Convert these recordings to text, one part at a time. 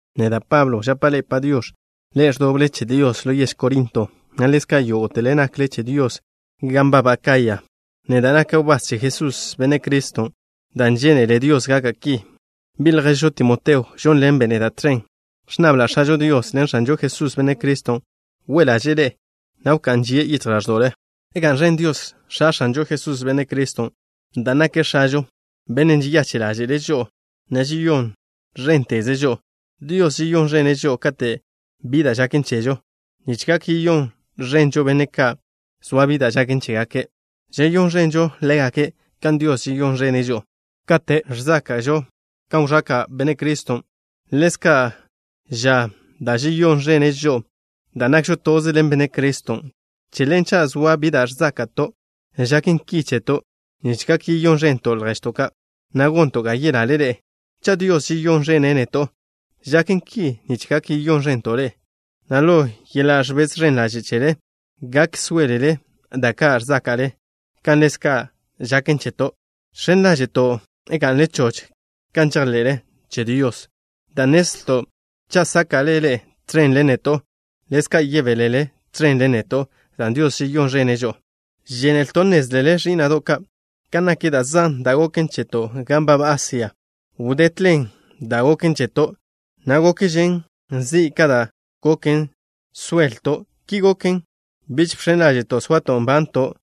Neda', Pablo, žapa' ḻe'e “Padiox̱”, ḻe'e ẕdoble che Dios ḻo yež Corinto, na' ḻezka' yógo'tele nakle che Dios gan nbab Acaya. Neda' naka' wbás che Jesús, Benne' Criston', dan' žénele Dios gaka' ki. Bi' lježžo Timoteo žónḻenbe' neda' tẕen. Ẕnnabla' X̱ažo Dios ḻen X̱anžo Jesús, Benne' Criston', we' ḻaže'e ḻe'e, na' wká'n žie' yichj ḻáẕdo'le. ¡Ga'n ẕen Dios, X̱a X̱anžo Jesús, Benne' Criston', dan' nake' X̱ažo, Bennen' žeyache' ḻáže'le' žo'o, na' žeyón ẕénteze' žo'o! Dios žeyón ẕene' žo'o kate' bi da' žaken chežo, nich gak yeyón ẕenžo benne' ka' zoa bi da' žaken chégake'. Žeyón ẕenžo ḻégake' kan Dios žeyón ẕene' žo'o. Kan žan da' ẕzáka'žo kan wẕaka' Benne' Criston', ḻezka' žan da' žeyón ẕenen žo'o, dan' nakžo toze ḻen Benne' Criston'. Che ḻen, cha' zoa bi da' ẕzáka'to', žaken ki cheto' nich gak yeyón ẕento' lježto' ka', na' gonto' ga yelale ḻe'e. Cha' Dios žeyón ẕene' neto', žaken ki nich gak yeyón ẕento' ḻe'e, na' ḻo yeḻa' ẕbez ẕen ḻaže' chele, gak sóelele da' ka' ẕzáka'le, kan ḻezka' žaken cheto'. Žx̱en ḻáže'to' ga'nle choch kan žejḻe'le che Dios, dan' nnezlto' cha' sáka'le ḻe'e tẕen ḻen neto', ḻezka' yebélele tẕen ḻen neto' dan' Dios žeyón ẕene' žo'o. Žénelto' nnézlele, ẕí'na'do' ka', kan nak da' zan da' goken cheto' gan nbab Asia. Wdetlen dan' goken cheto', na' gokžen zi' ka da' gok soelto'. Ki goken, biž bx̱en ḻáže'to' soato' nbanto'.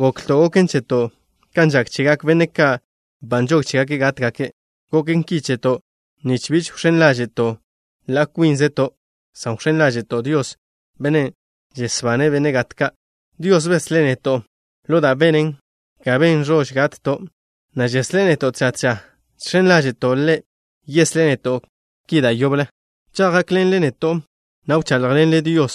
Goklto' goken cheto' kan žak chegak benne' ka' ba nžog chégake' gátgake'. Goken ki cheto' nich bi wx̱én ḻáže'to' ḻa' kwínzeto', san wx̱én ḻáže'to' Dios, Bennen' žesbane' benne' gat ka'. Dios beslé' neto' ḻo da' benen ga ben ẕož gatto', na' žeslé' neto' tža tža. Žx̱en ḻáže'to' Ḻe' yeslé' neto' ki da' yoble, cha' gákḻenle neto', na' wcháḻjḻenle Dios,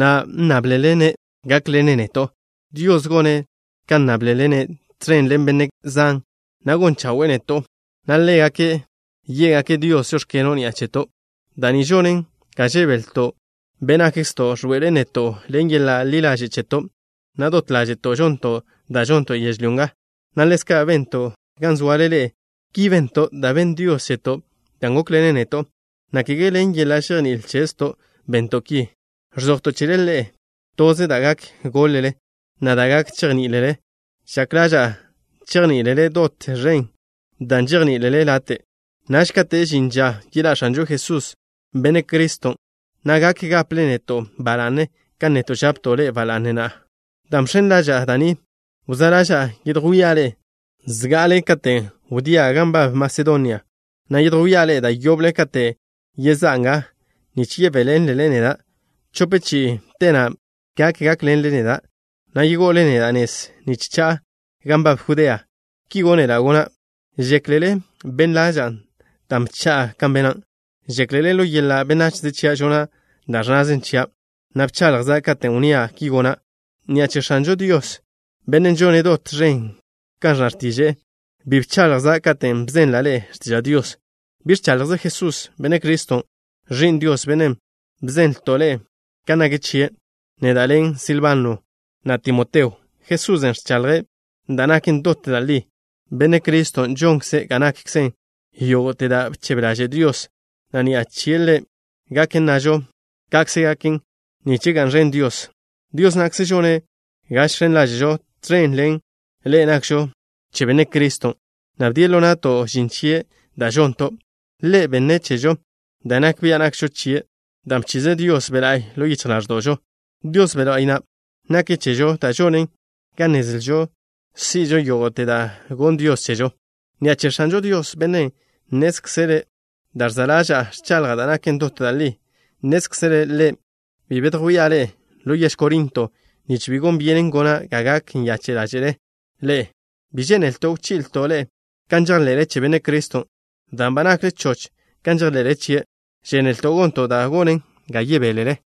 na' nnáblele-ne' gákḻene' neto'. Dios gone' kan nnáblele-ne' tẕen ḻen benne' zan, na' gon chawe'e neto', na' ḻégake' yé'gake' Dios: “Žóx̱keno'” ni'a cheto'. Da' ni žonen ga žebelto'. Be' nakkzto' ẕḻoe'elen neto', ḻen yeḻa' ḻi ḻaže' cheto', na' dot ḻáže'to' žonto' da' žonto' yežlyó nga, na' ḻezka' bento' gan zoale ḻe'e. Ki bento', dan' benn Dios cheto' da' gókḻenen neto', na' kege ḻen yeḻa' žejní'il chezto' bento' ki. Ẕzojto' chele ḻe'e toze da' gak goḻ-le, na' da' gak chejní'ilele. Žak ḻaža'a chejní'ilele dot ẕen dan' žejní'ilele late'. Naž kate' žin ža yeḻá' X̱anžo Jesús, Benne' Criston', na' gak gaple neto' ba la'ne kan neto' žapto' ḻe'e ba la'ne na'a. Dan' bx̱en ḻaža'a da' ni, wzá' ḻaža'a yedjwía' ḻe'e zga'ale katen' wdía' gan nbab Masedonia, na' yedjwía' ḻe'e da' yoble kate' yezá'a nga, nich yebéḻenlele neda' chope chi'i. Te na' gak gákḻenle neda', na' yego'ole neda' nez nich cha'a gan nbab Judea. Ki gónela' gona'. ¿Žéklele ben ḻaža'a dan' bcha'a kan bena'? ¿Žéklele ḻo yeḻa' benachze chia' žona' da' ẕnnaze chia', na' bchaḻjza' katen' wnnía': ki gona'? Ni'a che X̱anžo Dios, Bennen' žone' dot ẕen kan ẕnna x̱tiže'e, bi bchaḻjza' katen' bzenla' ḻe'e x̱tiža' Dios. Bi ẕchaḻjze Jesús, Benne' Criston', Ẕi'n Dios, Bennen' bzenlto' ḻe'e kan nak chie', neda' ḻen Silbano, na' Timoteo. Jesusen' ẕchaḻje' da' naken dot da' li. Benne' Criston' žonkze' ga nakkzen yógo'te da' bchebe ḻaže' Dios, na' ni'a chie' Ḻe' gak nnažo: “Ka'kze gaken” nich ga'n ẕen Dios. Dios na'kze žone' ga žx̱en ḻáže'to' tẕen ḻen ḻe'e nakžo che Benne' Criston', na' bdie' ḻo na'to' žin chie' da' žonto'. Ḻe' benne' chežo da' nak bia' nakžo chie', dan' bchize' Dios Be' La'y ḻo yichj ḻáẕdo'žo. Dios Be' La'y na' nake' chežo da' žonen ga nnezlžo si'žo yógo'te da' gonn Dios chežo. Ni'a che X̱anžo Dios, Bennen' nnézkzele' da' ẕza' ḻaža'a, ẕchaḻja' da' naken dot da' li. Nnézkzele' Ḻe' bi bedjwía' ḻe'e ḻo yež Corinto, nich bi gon byenen gona' ga gak nyache' ḻáže'le ḻe'e. Bi žénelto' wchi'ilto' ḻe'e kan žejḻe'le che Benne' Criston', dan' ba nakle choch kan žejḻe'le chie'. Žénelto' gonto' da' gonen ga yebélele.